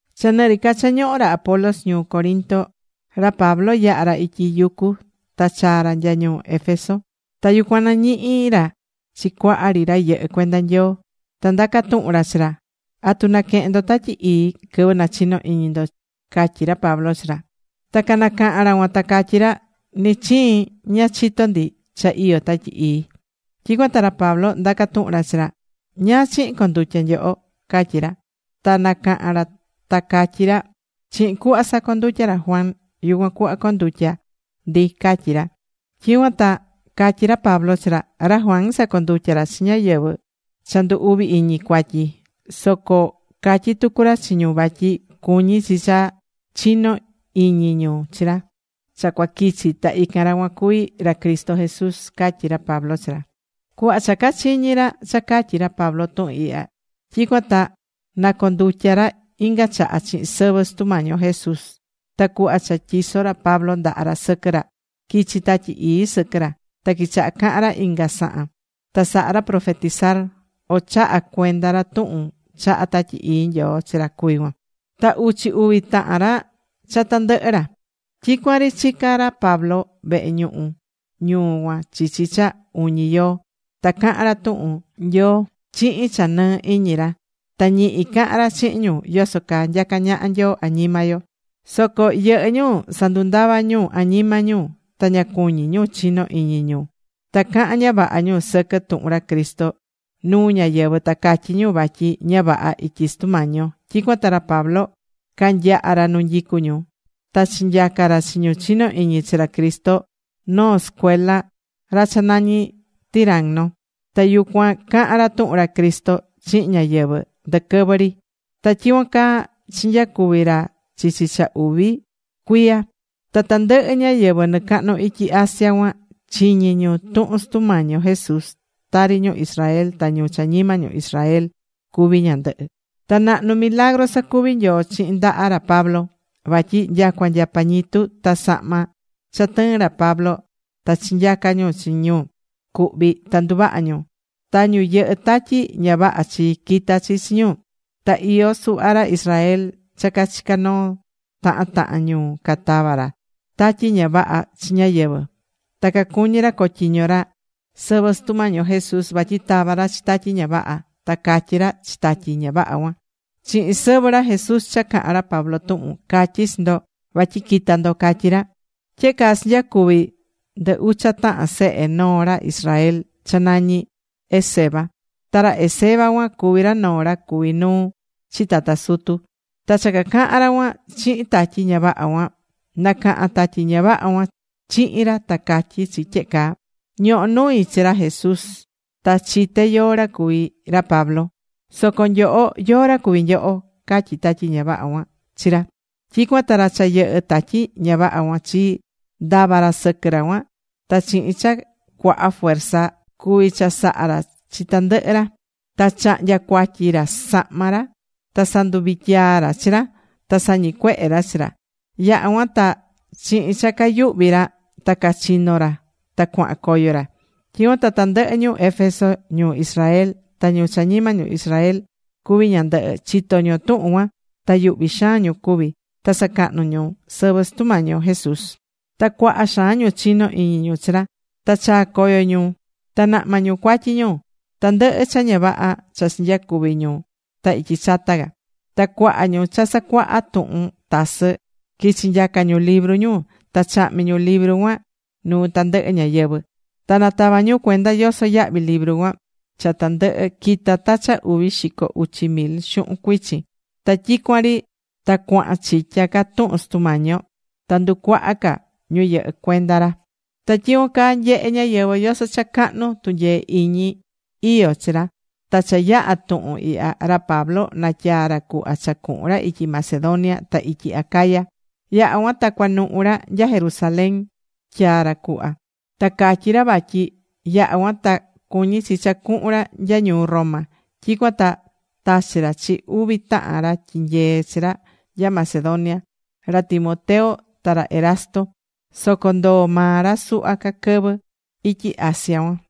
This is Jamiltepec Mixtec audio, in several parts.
Cha nɨ ri ca cha ñohó ra Apolos ñuu Corinto, ra Pablo yaha̱ ra ityi yucu ta chaa̱ ra nya ñuu Éfeso. Ta yucuan nañihi̱ ra chi cuaha ri ra yɨhɨ́ cuenda Nyoo. Ta ndaca̱ tuhun ra chi ra: ―¿Atu naquehe̱n ndo Tatyi Ii quɨvɨ nachino̱ iñi ndo? ―catyí ra Pablo chi ra. Ta canacaha̱n ra cuan ta catyí ra: ―Ni chiin ña chitó ndi cha iyó Tatyi Ii. Tyicuan ta ra Pablo ndaca̱ tuhun ra chi ra: ―¿Ñáá chihin condutya̱ nyoho? ―catyí ra. Ta nacaha̱n ra ta catyí ra: ―Chihin cuhva sacondutya̱ ra Juan yucuan cuhva condutya̱ ndi ―catyí ra. Tyicuan ta catyí ra Pablo chi ra: ―Ra Juan sacondutya̱ ra chi ñáyɨvɨ cha ndu uvi iñi cuatyi. Soco catyí tucu ra chi ñu vatyi cuñí chi cha chino iñi ñu chi ra cha cuaquichi ta ican ra cuan cuví ra Cristo Jesús ―catyí ra Pablo chi ra. Cuhva cha cachiñi̱ ra cha catyi̱ ra Pablo tuhun ihya, tyicuan ta nacondutya̱ ra inga chaha chihin sɨvɨ Sutu Mañi yo Jesús. Ta cuhva cha tyiso̱ ra Pablo ndaha ra sɨquɨ ra, quichi̱ Tatyi Ii sɨquɨ ra. Ta quichaha caha̱n ra inga sahan. Ta saha̱ ra profetizar, o chaha̱ cuenda ra tuhun chaha̱ Tatyi Ii Nyoo chi ra cuví cuan. Ta uchi uvi tahan ra cha tandɨhɨ ra. Tyicuan ri chica̱ ra Pablo vehe ñuhu ñuu cuan chichi cha uñi yoo. Ta caha̱n ra tuhun Nyoo chihin cha nɨɨ iñi ra. Ta ñihi cahán ra chihin ñu yoso caa nyacá ñaha Nyoo añima yo. Soco yɨhɨ́ ñu sandava̱ ñu añima ñu. Ta ña cuñí ñu chino iñi ñu. Ta cahán ña vaha ñu sɨquɨ tuhun ra Cristo nuu ñáyɨvɨ, ta catyí ñu vatyi ña vaha ityi Sutu Mañi yo. Tyicuan ta ra Pablo canyaha̱ ra nu nyicú ñu. Ta chinyaca̱ ra chi ñu chinó iñi chi ra Cristo noo sɨcuela ra cha nañí Tiranno. Ta yucuan cahán ra tuhun ra Cristo chihin ñáyɨvɨ ndɨquɨvɨ ri. Ta tyicuan caa chinyacuvi̱ ra chichi cha uvi cuiya. Ta tandɨhɨ ñáyɨvɨ nɨcahnu ityi Asia cuan chiñi̱ ñu tuhun Sutu Mañi yo Jesús, tari ñu Israel ta ñu cha ñima ñu Israel cuvi ñándɨhɨ. Ta nahnu milagru sacuvi̱ Nyoo chihin ndaha ra Pablo. Vatyi nyacua nya pañitu ta sahma cha tɨɨn ra Pablo, ta chinyaca̱ ñu chi ñu cuhví ta nduvaha̱ ñu. Ta ñu yɨhɨ́ tatyi ña vaha chi, quita̱ chi chi ñu. Ta iyó suhva ra Israel cha cachica̱ noo tahan tahan ñuu. Catava̱ ra tatyi ña vaha chi ñáyɨvɨ. Ta cacuñí ra cotyiño ra sɨvɨ Sutu Mañi yo Jesús vatyi tava̱ ra chi tatyi ña vaha. Ta catyí ra chi tatyi ña vaha cuan: ―Chihin sɨvɨ ra Jesús cha cahán ra Pablo tuhun catyí chi ndo vatyi qui̱ta ndo ―catyí ra. Tyehe caa chinyacuvi̱ ndɨ ucha tahan sehe noo ra Israel cha nañí Esceva. Ta ra Esceva cuan cuví ra noo ra cuví nuu chi tata sutu. Ta cha cacahaṉ ra cuan chihin tatyi ña vaha cuan, nacaha̱n tatyi ña vaha cuan chihin ra ta catyí chi tyehe caa: ―Ñohó nui chi ra Jesús. Ta chité yóó ra cuví ra Pablo. Soco nyoho ¿yóó ra cuví nyoho? ―catyí tatyi ña vaha cuan chi ra. Tyicuan ta ra cha yɨhɨ́ tatyi ña vaha cuan chii, ndava̱ ra sɨquɨ ra cuan. Ta chihin cha cuaha fuerza ra cuvi̱ chasaha ra chi tandɨhɨ ra. Ta chahnya̱ cuatyi ra sahma ra. Ta sanduvityaa̱ ra chi ra. Ta sañicuehe̱ ra chi ra. Yucuan ta chihin cha cayuhvi ra ta cachino̱ ra ta cuaha̱n coyo ra. Tyicuan ta tandɨhɨ ñu Éfeso, ñu Israel, ta ñu cha ñima ñu Israel cuví ñandɨhɨ, chito̱ ñu tuhun cuan. Ta yuhvi̱ xaan ñu cuvi̱. Ta sacahnú ñu sɨvɨ Sutu Mañi yo Jesús. Ta cuaha xaan ñu chinó iñi ñu chi ra. Ta chaa̱ coyo ñu ta nahma̱ ñu cuatyi ñu, tandɨhɨ cha ña vaha cha chinyacuvi̱ ñu ta ityi chata ca. Ta cuaha ñu cha sacuaha̱ tuhun tasɨ, quichi̱ nyaca ñu libru ñu. Ta chahmi̱ ñu libru cuan nuu tandɨhɨ ñáyɨvɨ. Ta natava̱ ñu cuenda yoso yahvi libru cuan. Cha tandɨhɨ quita̱ ta cha uvi xico uchi mil xuhun cuichin. Ta tyicuan ri ta cuahan chitya ca tuhun Sutu Mañi yo. Ta nducuaha̱ ca ñu yɨhɨ́ cuenda ra. Ta tyicuan caa nyehé ñáyɨvɨ yoso cha cahnu tunyee iñi iyó chi ra. Ta cha yaha̱ tuhun ihya, ra Pablo natyaa̱ ra cuhva cha cuhun ra ityi Macedonia, ta ityi Acaya. Yaha̱ cuan ta cunuhu̱ ra nya Jerusalén tyaá ra cuhva. Ta catyí ra vatyi yaha̱ cuan ta cuñi chi cha cuhun ra nya ñuu Roma. Tyicuan ta tachi̱ ra chi uvi tahan ra tyinyeé chi ra nya Macedonia, ra Timoteo ta ra Erasto. Soco ndoo̱ maa ra suhva ca quɨvɨ ityi Asia cuan.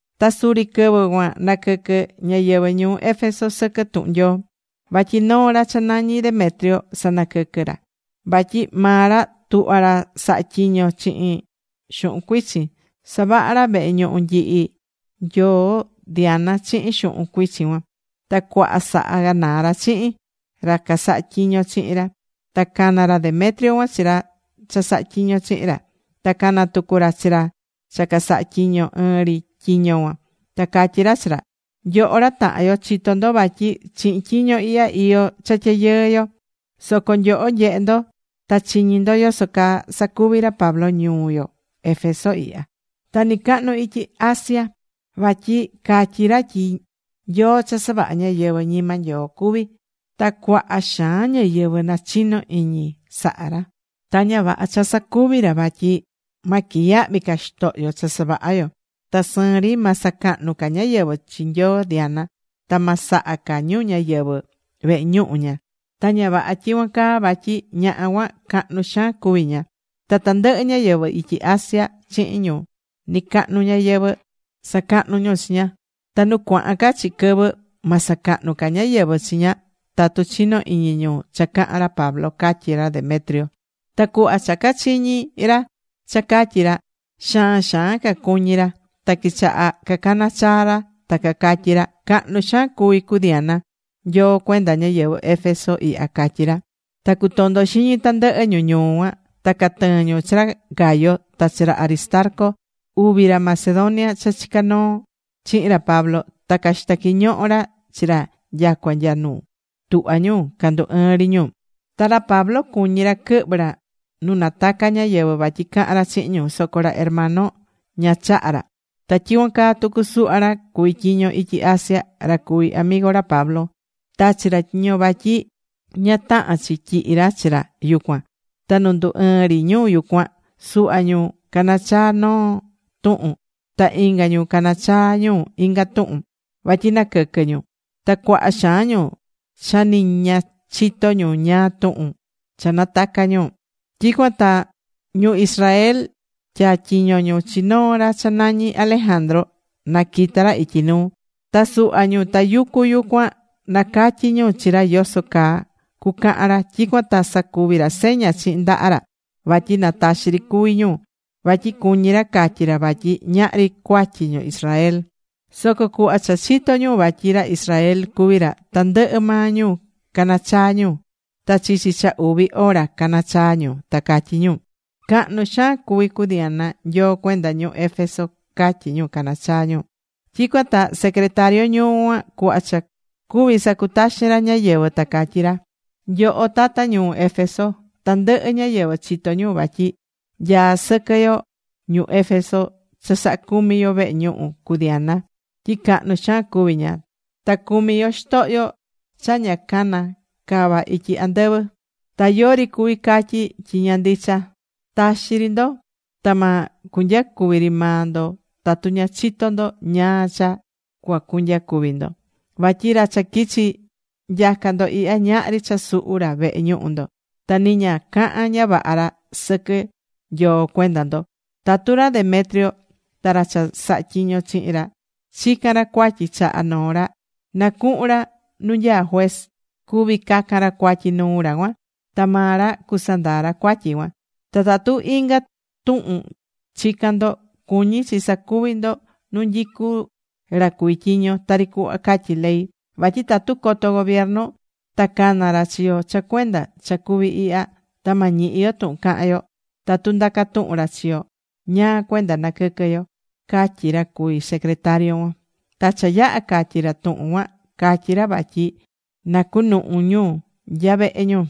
Ta suri quɨvɨ cuan naquɨquɨ̱ ñáyɨvɨ ñuu Éfeso sɨquɨ tuhun Nyoo, vatyi noo ra cha nañí Demetrio sanaquɨquɨ́. Vatyi maa ra tuhvá ra saha tyiño chihin xuhun cuichin. Savahá ra vehe ñuhu nyihi nyoo Diana chihin xuhun cuichin cuan. Ta cuaha sahá ganaa ra chihin ra casahá tyiño chihin ra. Ta cana̱ ra Demetrio cuan chi ra cha sahá tyiño chihin ra. Ta cana̱ tucu ra chi ra cha casahá tyiño ɨɨn ri tyiño cuan. Ta catyí ra chi ra: ―Nyoho ra tahan yo, chitó ndo vatyi chihin tyiño ihya iyó cha tyayɨɨ yo. Soco nyoho nyehé ndo ta chiñí ndo yoso caa sacuví ra Pablo ñuu yo Éfeso ihya, ta nɨcahnu ityi Asia. Vatyi catyí ra tyi nyoo cha savahá ñáyɨvɨ ñima Nyoo cuví. Ta cuaha xaan ñáyɨvɨ nachino iñi sahá ra. Ta ña vaha cha sacuví ra vatyi ma quiyahvi ca xitohyo cha savahá yo. Ta sɨɨn ri ma sacahnu ca ñáyɨvɨ chi nyoo Diana ta ma saha ca ñu ñáyɨvɨ vehe ñuhu ña, ta ña vaha tyicuan caa, vatyi ñaha cuan cahnu xaan cuví ña. Ta tandɨhɨ ñáyɨvɨ ityi Asia chihin ñu nɨcahnu ñayɨvɨ̱ sacahnú ñu chi ña. Ta nu cuahan ca chi quɨvɨ ma sacahnu ca ñáyɨvɨ chi ña tatu chino iñi ñu cha cahán ra Pablo ―catyí ra Demetrio. Ta cuhva cha cachiñi̱ ra cha catyí ra, Xaan xaan cacuñí ra. Ta quichaha cacana̱ chaa ra ta cacatyí ra: ―Cahnu xaan cuvi cu Diana, nyoo cuenda ñáyɨvɨ Éfeso ihya ―catyí ra. Ta cutondo̱ xiñi tandɨhɨ ñu ñuu cuan. Ta catɨɨ̱n ñu chi ra Gayo, ta chi ra Aristarco, uvi ra Macedonia cha chicá noo chihin ra Pablo. Ta caxita̱ quiñoho ra chi ra nyacua nya nu tuhva ñu candu ɨɨn ri ñu. Ta ra Pablo cuñí ra quɨhvɨ ra nu nataca ñáyɨvɨ vatyi cahan ra chihin ñu. Soco ra hermano, ña chaha̱ ra. Ta tyicuan caa tucu suhva ra cuví tyiño ityi Asia, ra cuví amigo ra Pablo, tachi̱ ra tyiño vatyi ña tahán chi tyihi ra chi ra yucuan. Ta nu ndu ɨɨn ri ñu yucuan, suhva ñu caná chaa noo tuhun. Ta inga ñu caná chaa ñu inga tuhun. Vatyi naquɨquɨ́ ñu. Ta cuaha xaan ñu cha ni ña chitó ñu ñáá tuhun cha natacá ñu. Tyicuan ta ñu Israel, tyatyiño̱ ñu chi noo ra cha nañí Alejandro na quita ra ityi nuu. Ta suhva ñu tayucú yucuan nacatyi̱ ñu chi ra yoso caa cucahan ra. Tyicuan ta sacuvi̱ ra seña chihin ndaha ra vatyi na taxi ri cuvi ñu vatyi cuñí ra catyi ra vatyi ñahri cuatyi ñu Israel. Soco cuhva cha chito̱ ñu vatyi ra Israel cuví ra, tandɨhɨ maa ñu cana̱ chaa ñu. Ta chichi cha uvi hora caná chaa ñu, ta catyí ñu: ―Cahnu xaan cuví cu Diana nyoo cuenda ñu Éfeso ―catyí ñu, caná chaa ñu. Tyicuan ta secretario ñuu cuan cuhva cha cuvi̱ sacutaxin ra ñáyɨvɨ, ta catyí ra: ―Nyoho tata ñuu Éfeso ihya. Tandɨhɨ ñáyɨvɨ chitó ñu vatyi nyaá sɨquɨ yo ñu Éfeso cha saha cumi yo vehe ñuhu cu Diana tyi cahnu xaan cuví ña. Ta cumí yo xitohyo ña cha cana̱ cava ityi andɨvɨ. Ta yori cuvi catyí tyi ña ndicha. Taxi ri ndo, ta ma cunyacuvi ri maa ndo tatu ña chitó ndo ñáá cha cuacunyacuvi ndo. Vatyi ra cha quichi̱ nyaca ndo ihya ñahri cha suhu̱ ra vehe ñuhu ndo. Ta ni ña cahán ña vaha ra sɨquɨ nyoo cuenda ndo. Tatu ra Demetrio ta ra cha sahá tyiño chihin ra chicán ra cuatyi chaha noo ra, na cuhun ra nu nyaá juez. Cuví cacan ra cuatyi nuu ra cuan, ta maa ra cusandaa ra cuatyi cuan. Ta tatu inga tuhun chicán ndo, cuñí chi sacuví ndo nu nyicu ra cuví tyiño, tari cuhva catyí ley. Vatyi tatu coto gobiernu ta cana ra chi yo cha cuenda cha cuvi̱ ihya, ta ma ñihi yo tuhun cahan yo tatu ndacá tuhun ra chi yo ñáá cuenda naquɨquɨ̱ yo ―catyí ra cuví secretario cuan. Ta cha yaha̱ catyi̱ ra tuhun cuan catyí ra vatyi na cunuhu ñu nya vehe ñu.